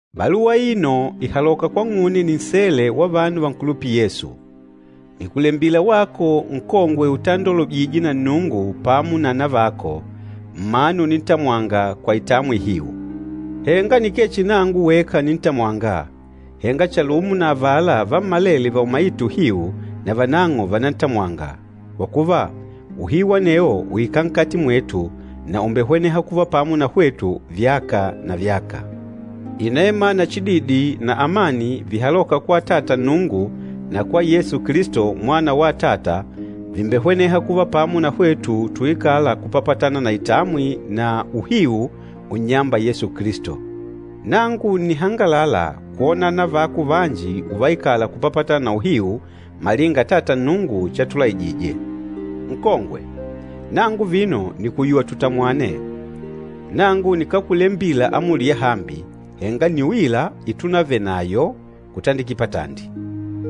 Baluwa aino ìhaloka kwang'une ninsele wa vanu vankulupîla Yesu. Nìkulembila wako nkongwe utandolwejîje na Nnungu pamo na anavako, mmanu unintamwanga kwa itamwi ihiu. Henga nikee chihi nangu weka nintamwânga, henga chalumo na avala vammalele vaumaîte uhiu na vanang'o vànantamwanga, kwa kuva, uhiu anewo ùikala nkati mwetu na ùmbehweneha kuva pamo na hwetu vyaka na vyaka. Inema na chididi na amani vihalôka kwa Atata Nnungu na kwa Yesu Kilisto, Mwana wa Atata, vìmbehweneha kuva pamo na hwetu tuikâla kupapatana na itamwi na uhiu unnyâmba Yesu Kilisto. Nangu ǹnihangalala kwona anavako vanji uvaikala kupapatana na uhiu, malinga Atata Nnungu chatulaijije. Nkongwe, nangu vino nìkuyuwa tutamwane. Nangu nikákulembila amuli yahambi, henga nni uila itunavenayo kutandikila patandi.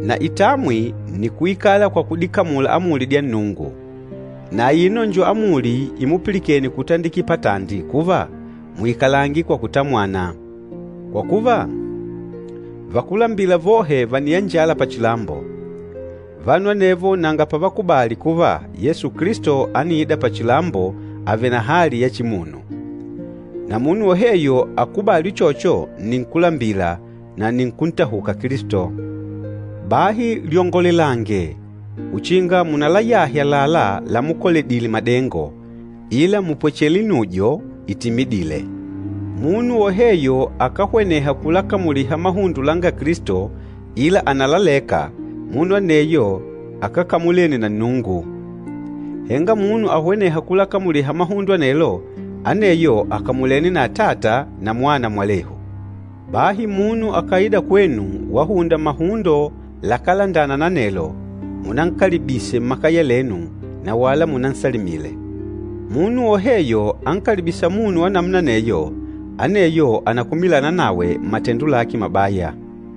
Na itamwi nni kuikala kwa kudikamula amuli dya Nnungu. Na aino njo amuli imupilikene kutandikila patandi kuva, muikalange kwa kutamwana. Kwa kuva, vakúlambila vohe vàniyanjala pachilambo. Vanu anevo nanga pavakubali kuva Yesu Kilisto ániida pachilambo avèlè na hali ya chimunu. Na munu woheyo akákubali uchocho nni nkúlambila na nni nkúntahuka Kilisto. Bahi lyongolelange uchinga munalayahe àlalá lamukoledile madengo, ila mupwechele inujo itimidîle. Munu woheyo akáhweneha kulakamuliha mahundo langa Kilisto, ila ànalaleka, munu aneyo akákamulene na Nnungu. Henga munu ahwenêha kulakamuliha mahundo anelo, aneyo àkamulene na Atata na Mwana mwalehu. Bahi munu akàida kwenu wahunda mahundo lakálandana na anelo, munankalibise mmakaya lenu na wala munansalimile. Munu woheyo ankalibîsa munu wa namuna aneyo, aneyo ànakumilana nawe mmatendo lake mabaya.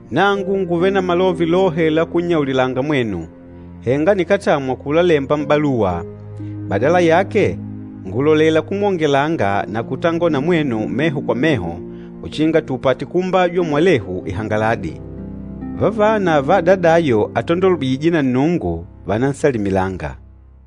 Nangu ngùvele na malove lohe la kunnyaulilanga mwenu, henga nikátamwa kulalemba m'baluwa. Badala yake, ngùlolela kumwongelanga na kutangola na mwenu meho kwa meho uchinga tupate kuumbajwa mwalehu ihangaladi. Vavana va adadayo atandolwejîje na Nnungu, vànansalimilanga.